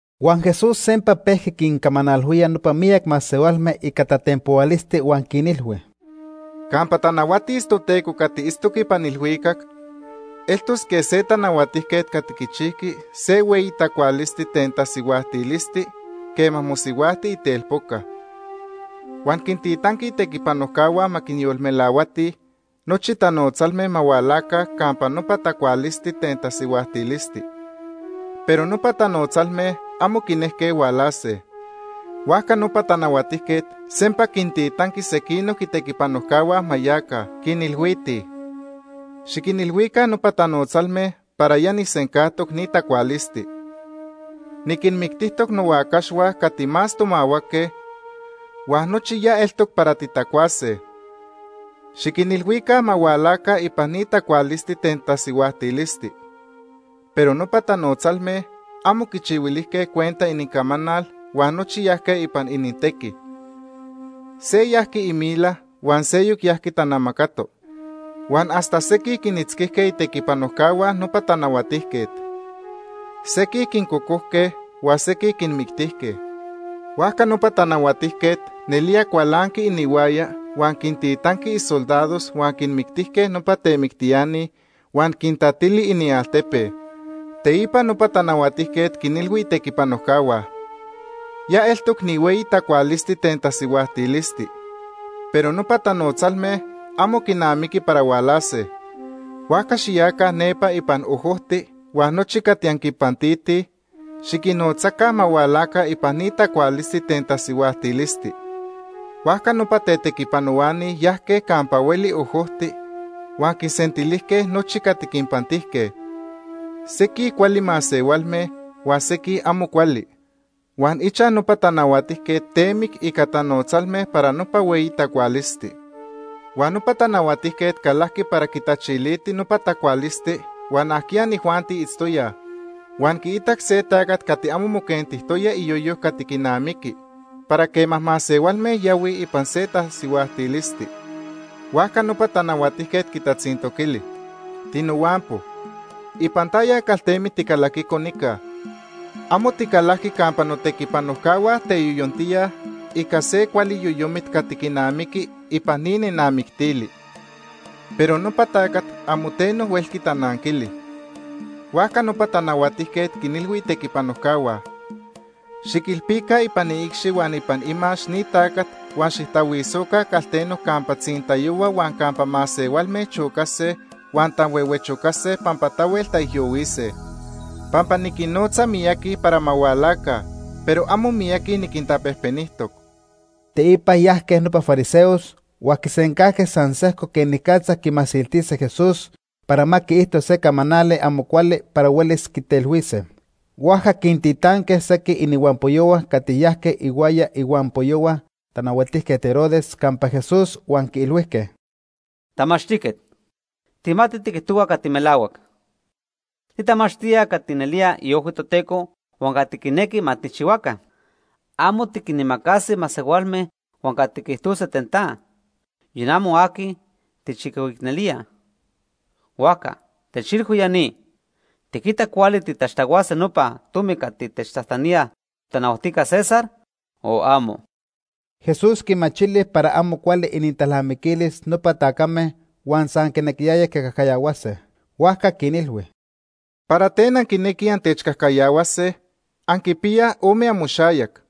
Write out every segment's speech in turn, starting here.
Huan Jesús sempa pejqui quincamanalhuía nopa miyac masehualme ica tatenpohualisti huan quinilhui: “Campa tanahuatis Toteco cati itztoc ipan ilhuicac, eltos quej se tanahuatijquet cati quichijqui se hueyi tacualisti ten tasihuajtilisti quema mosihuajti itelpoca. Huan quintitanqui itequipanojcahua ma quinyolmelahuatij nochi tanotzalme ma hualaca campa nopa tacualisti ten tasihuajtilisti, pero nopa tanotzalme amo quinejque hualase. “Huajca nopa tanahuatijquet sempa quintitanqui sequinoc itequipanojcahua ma yaca, quinilhuitij: ‘Xiquinilhuica nopa tanotzalme para ya nijsencajtoc ni tacualisti. Niquinmictijtoc nohuacaxhua cati más tomahuaque, huan nochi ya eltoc para titacuase. Xiquinilhuica ma hualaca ipan ni tacualisti ten tasihuajtilisti.’ Pero nopa tanotzalme amo quichihuilijque cuenta inincamanal huan nochi yajque ipan inintequi. Se yajqui imila huan seyoc yajqui tanamacato. Huan hasta sequij quinitzquijque itequipanojcahua nopa tanahuatijquet. Sequij quincocojque huan sequij quinmictijque. Huajca nopa tanahuatijquet nelía cualanqui inihuaya huan quintitanqui isoldados huan quinmictijque nopa temictiani huan quitatili inialtepe. “Teipa nopa tanahuatijquet quinilhui itequipanojcahua: ‘Ya eltoc ni hueyi tacualisti ten tasihuajtilisti, pero nopa tanotzalme amo quinamiqui para hualase. Huajca xiyaca nepa ipan ojojti huan nochi cati anquinpantitij, xiquinnotzaca ma hualaca ipan ni tacualisti ten tasihuajtilisti.’ Huajca nopa tetequipanohuani yajque campa hueli ojojti huan quinsentilijque nochi cati quinpantijque, sequij cuali masehualme huan sequij amo cuali. Huan ichaj nopa tanahuatijquet temic ica tanotzalme para nopa hueyi tacualisti. “Huan nopa tanahuatijquet calajqui para quitachiliti nopa tacualisti huan ajquiya inijuanti itztoyaj, huan quiitac se tacat cati amo moquentijtoya iyoyo cati quinamiqui para quema masehualme yahuij ipan se tasihuajtilisti. Huajca nopa tanahuatijquet quitatzintoquili: ‘Tinohuampo, ¿ipan taya caltemit ticalaquico nica? Amo ticalajqui campa notequipanojcahua teyoyontíaj ica se cuali yoyomit cati quinamiqui ipan ni nenamictili.’ Pero nopa tacat amo teno huelqui tananquili. Huajca nopa tanahuatijquet quinilhui itequipanojcahua: ‘Xiquilpica ipan iicxi huan ipan imax ni tacat huan xijtahuisoca calteno campa tzintayohua huan campa masehualme chocase huan tanhuehuechocase pampa tahuel taijyohuise.’ Pampa niquinnotza miyaqui para ma hualaca, pero amo miyaqui niquintapejpenijtoc.” Teipa yajque nopa fariseos huan quisencajque san sejco quenicatza quimasiltise Jesús para ma quiijto se camanali amo cuali para huelis quitelhuise. Huajca quintitanque sequij inihuampoyohua cati yajque ihuaya ihuampoyohua Tanahuatijquet Herodes campa Jesús huan quiilhuijque: ―Tamachtijquet, tijmatij tiquijtohua cati melahuac. Titamachtía cati nelía iojhui Toteco huan cati quinequi ma tijchihuaca. Amo tiquinimacasi masehualme huan cati quiijtose ten ta, yon amo aqui tijchicoicnelía. Huajca techilhui ya ni. ¿Tiquita cuali titaxtahuase nopa tomi cati techtajtanía totanahuatijca César, o amo? Jesús quimachili para amo cuali inintalnamiquilis nopa tacame huan san quinequiyayaj quicajcayahuase. Huajca quinilhui: ―¿Para ten anquinequij antechcajcayahuase, anquipiyaj ome amoxayac?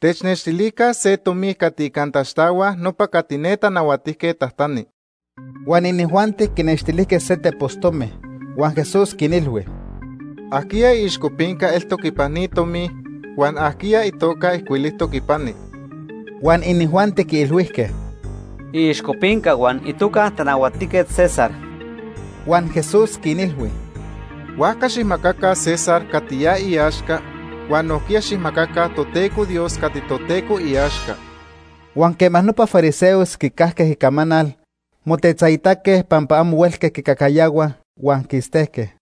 Technextilica se tomi cati ica antaxtahuaj nopa cati ne tanahuatijquet tajtani. Huan inijuanti quinextilijque se tepos tomi. Huan Jesús quinilhui: ―¿Ajquiya iixcopinca eltoc ipan ni tomi? Huan ¿ajquiya itoca ijcuilijtoc ipani? Huan inijuanti quiilhuijque: ―Iixcopinca huan itoca Tanahuatijquet César. Huan Jesús quinilhui: ―Huajca xijmacaca César cati ya iaxca huan nojquiya xijmacaca Toteco Dios cati Toteco iaxca. Huan quema nopa fariseos quicajque icamanal, motetzaitaque pampa amo huelque quicajcayahuaj, huan quistejque.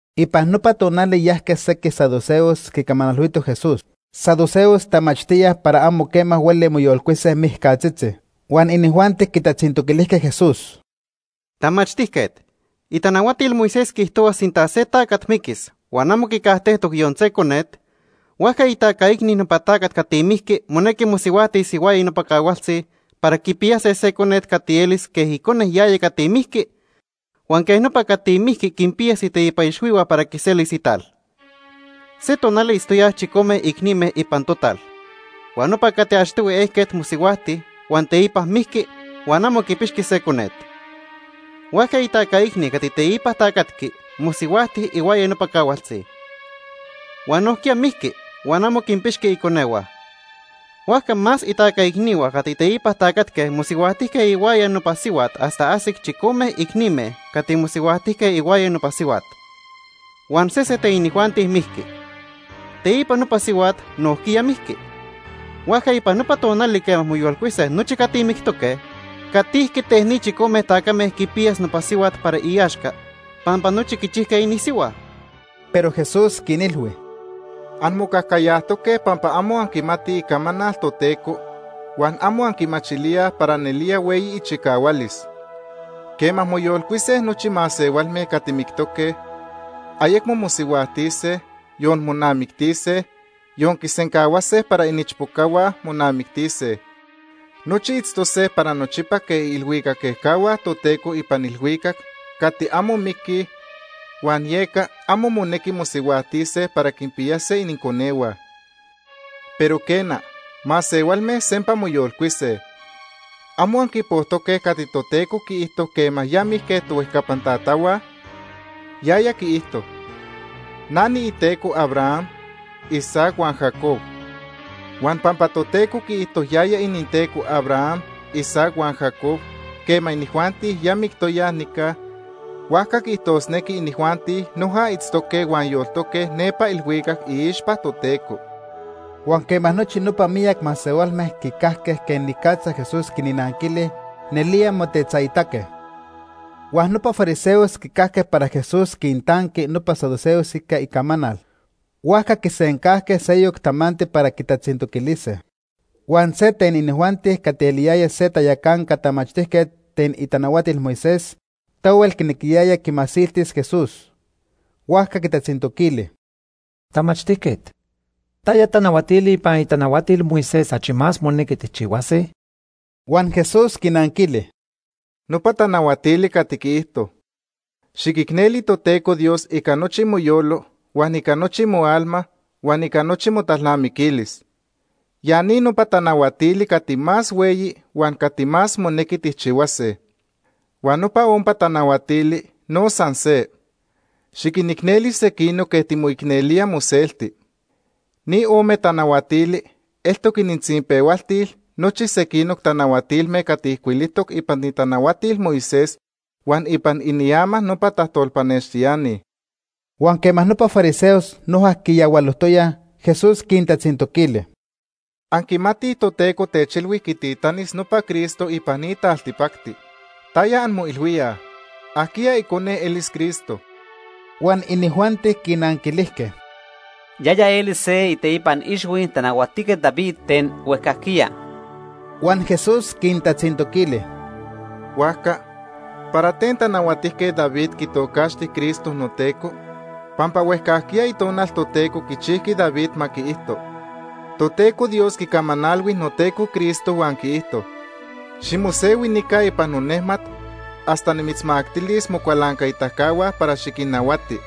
Ipan nopa tonali yajque sequij saduceos quicamanalhuitoj Jesús. Saduceos tamachtíaj para amo quema hueli moyolcuise mijcatzitzi. Huan inijuanti quitatzintoquilijque Jesús: ―Tamachtijquet, itanahuatil Moisés quiijtohua sinta se tacat miquis huan amo quicajtejtoc yon se conet, huajca itaca icni nopa tacat cati mijqui monequi mosihuajtis ihuaya nopa cahualtzi para quipiyase se conet cati elis quej icone yaya cati mijqui huan quej nopa cati mijqui quinpiyas iteipan ixhuihua para quiselis ital. Se tonali itztoyaj chicome icnime ipan total, huan nopa cati achtohui ejquet mosihuajti huan teipa mijqui huan amo quipixqui se conet. Huajca itaca icni cati teipa tacatqui mosihuajti ihuaya nopa cahualtzi. Huan nojquiya mijqui huan amo quinpixqui iconehua. Huajca más itaca icnihua cati teipa tacatque mosihuajtijque ihuaya nopa sihuat hasta ajsic chicome icnime cati mosihuajtijque ihuaya nopa sihuat, huan sese ten inijuanti mijqui. Teipa nopa sihuat nojquiya mijqui. Huajca ipan nopa tonali quema moyolcuise nochi cati mictoque, ¿catijqui ten nopa chicome tacame quipiyas nopa sihuat para iaxca pampa nochi quichijque inisihua? Pero Jesús quinilhui: ―Anmocajcayajtoque pampa amo anquimatij Icamanal Toteco huan amo anquimachilíaj para nelía hueyi ichicahualis. Quema moyolcuise nochi masehualme cati mictoque, ayecmo mosihuajtise, yon monamictise, yon quisencahuase para iniichpocahua monamictise. Nochi itztose para nochipa quej iilhuicac ejcahua Toteco ipan ilhuicac cati amo miquij huan yeca amo monequi mosihuajtise para quinpiyase ininconehua. Pero quena, masehualme sempa moyolcuise. ¿Amo anquipojtoque cati Toteco quiijto quema ya mijque tohuejcapan tatahua? Yaya quiijto: ‘Na niiTeco Abraham, Isaac huan Jacob.’ Huan pampa Toteco quiijto yaya ininTeco Abraham, Isaac huan Jacob quema inijuanti ya mictoyaj nica, huajca quiijtosnequi inijuanti noja itztoque huan yoltoque nepa ilhuicac iixpa Toteco. Huan quema nochi nopa miyac masehualme quicajque quenicatza Jesús quinnanquili, nelía motetzaitaque. Huan nopa fariseos quicajque para Jesús quintanqui nopa saduceos ica icamanal, huajca quisencajque seyoc tamanti para quitatzintoquilise. Huan se ten inijuanti cati eliyaya se tayacanca tamachtijquet ten itanahuatil Moisés tahuel quinequiyaya quimasiltis Jesús. Huajca quitatzintoquili: ―Tamachtijquet, ¿taya tanahuatili ipan itanahuatil Moisés achi más monequi tijchihuase? Huan Jesús quinanquili: ―Nopa tanahuatili cati quiijto: ‘Xiquicneli Toteco Dios ica nochi moyolo, huan ica nochi moalma, huan ica nochi motalnamiquilis.’ Ya ni nopa tanahuatili cati más hueyi huan cati más monequi tijchihuase. Huan nopa ompa tanahuatili no san se: ‘Xiquinicneli sequinoc quej timoicnelía moselti.’ Ni ome tanahuatili eltoc inintzinpehualtil nochi sequinoc tanahuatilme cati ijcuilijtoc ipan itanahuatil Moisés huan ipan iniama nopa tajtolpanextiani. Huan quema nopa fariseos noja quiyahualojtoyaj, Jesús quintatzintoquili: ―Anquimatij Toteco techilhui quititanis nopa Cristo ipan ni taltipacti. ¿Taya anmoilhuíaj? ¿Ajquiya icone elis Cristo? Huan inijuanti quinanquilijque: ―Yaya elis se iteipan ixhui Tanahuatijquet David ten huejcajquiya. Huan Jesús quintatzintoquili: ―Huajca, ¿para ten Tanahuatijquet David quitocaxti Cristo ‘noTeco’? Pampa huejcajquiya Itonal Toteco quichijqui David ma quiijto: ‘Toteco Dios quicamanalhui noTeco Cristo huan quiijto: Ximosehui nica ipan nonejmat hasta nimitzmactilis mocualancaitacahua para xiquinnahuati.’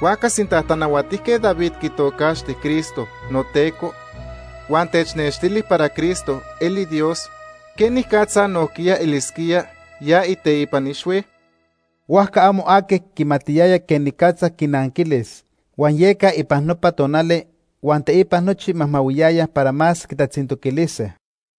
Huajca sinta Tanahuatijquet David quitocaxti Cristo ‘noTeco’ huan technextili para Cristo eli Dios, ¿quenicatza nojquiya elisquía ya iteipan ixhui? Huajca amo aqui quimatiyaya quenicatza quinanquilis, huan yeca ipan nopa tonali huan teipa nochi majmahuiyayaj para más quitatzintoquilise.